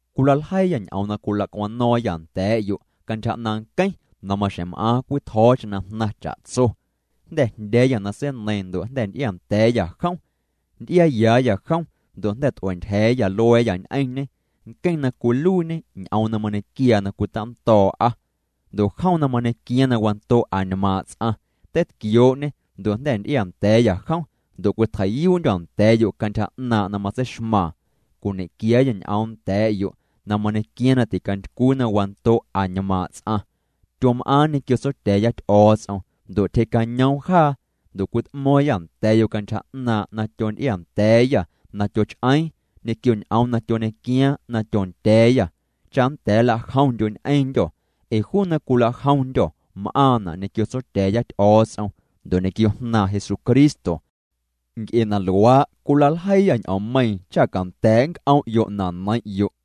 Cwilaljeiiyâ ñ'oom na cwilacwano̱o̱ⁿyâ nda̱a̱'yo' cantyja 'naaⁿ' nqueⁿ na maxjeⁿ m'aaⁿ cwitjo̱o̱cheⁿ na jnaⁿ cha'tso. Jnda̱ jndya̱a̱yâ na seineiiⁿ ndo' jnda̱ nty'iaa nda̱a̱yâ jom. Nty'iaayaayâ jom ndo' jnda̱ t'ua̱a̱ ntyja̱a̱yâ lua̱a̱yâ ñ'eⁿñê, nqueⁿ na cwiluiiñê Ñ'oom na mañequiaa na cwitando̱o̱'a. Ndo' jom na mañequiaaⁿ na wando' añmaaⁿ' ts'aⁿ, teitquioo'ñê ndo' jnda̱ nty'iaa nda̱a̱yâ jom ndo' cwitjei'yuu'ndyô̱ nda̱a̱'yo' cantyja 'naaⁿ' na matseixmaaⁿ. Cwiñequiaayâ ñ'oom nda̱a̱'yo' na mañequiaaⁿ na ticantycwii na wando' añmaaⁿ' ts'aⁿ. Tyom'aaⁿ ñequio Tsotya̱a̱ya Ty'o̱o̱ts'om ndo' tyjee'cañoom jaa. Ndo' cwit'mo̱o̱ⁿyâ nda̱a̱'yo' cantyja 'naaⁿ' na tyonty'iaa nda̱a̱yâ na tyoch'eeⁿ, ñequio ñ'oom na tyoñequiaaⁿ na tyondya̱a̱yâ, cha nnda̱a̱ nla'jomndyo' ñ'eⁿndyô̱ ee juu na cwilajomndyô̱ m'aaⁿna' ñequio Tsotya̱a̱ya Ty'o̱o̱ts'om ndo' ñequio Jnaaⁿ Jesucristo. Nc'e na luaa', cwila'ljeiiyâ ñ'oommeiiⁿ cha canda̱a̱' nnc'om'yo' na neiⁿ'yo'.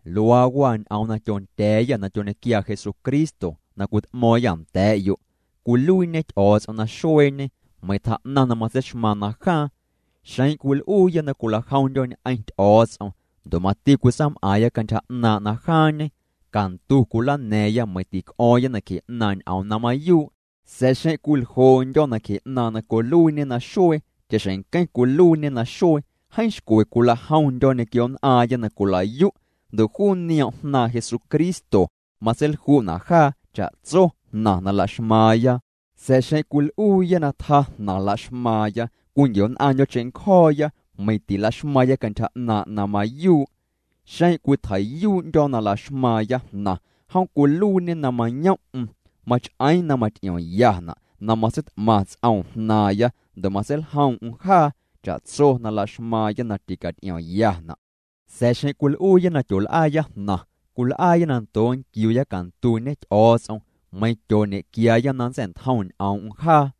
Luaa waa ñ'oom na tyonda̱a̱yâ na tyoñequiaa Jesucristo na cwit'mo̱o̱ⁿyâ nda̱a̱'yo', cwiluiiñe Ty'o̱o̱ts'om na xueeñe meiⁿ tjaa'naⁿ na matseixmaaⁿ na jaaⁿ. Xeⁿ cwil'uuya na cwilajomndyo̱ ñ'eⁿ Ty'o̱o̱ts'om, ndo' mati cwitsaam'aaⁿya cantyja 'naaⁿ' na jaaⁿñe, cantu cwilana̱a̱ⁿya meiⁿ tic'o̱o̱ⁿya nacje 'naaⁿ' ñ'oom na mayuu'. Sa̱a̱ xeⁿ cwiljoo'ndyo̱ nacje 'naaⁿ' na cwiluiiñe naxuee cha'xjeⁿ nqueⁿ cwiluiiñê naxuee, jeeⁿ xcwe cwilajomndyo̱ ñequio nn'aaⁿya na cwila'yu', ndo' juu nioom' Jnaaⁿ Jesucristo matseilju'na' jaa cha'tso jnaⁿ na laxmaaⁿya. Sa̱a̱ xeⁿ cwil'uuya na tjaa jnaⁿ laxmaaⁿya, cwinquio̱'nn'aⁿndyo̱ cheⁿncjo̱o̱ya, meiⁿ tilaxmaaⁿya cantyja 'naaⁿ' na mayuu'. Xeⁿ cwitjei'yuu'ndyo̱ na laxmaaⁿya jnaⁿ, jom cwiluiiñê na mayoom'm. Mach'eeⁿ na maty'iomyana' na matseit'maⁿ ts'oom jnaaⁿya ndo' na matseiljoom'm jaa cha'tso na laxmaaⁿya na ticaty'iomyana'. Sa̱a̱ xeⁿ cwil'uuya na tyool'aaya jnaⁿ, cwil'aaya na ndoo' nquiuya cantuñe Ty'o̱o̱ts'om, meiⁿ tyooñequiaaya na nntsa̱'ntjom ñ'oom'm jaa.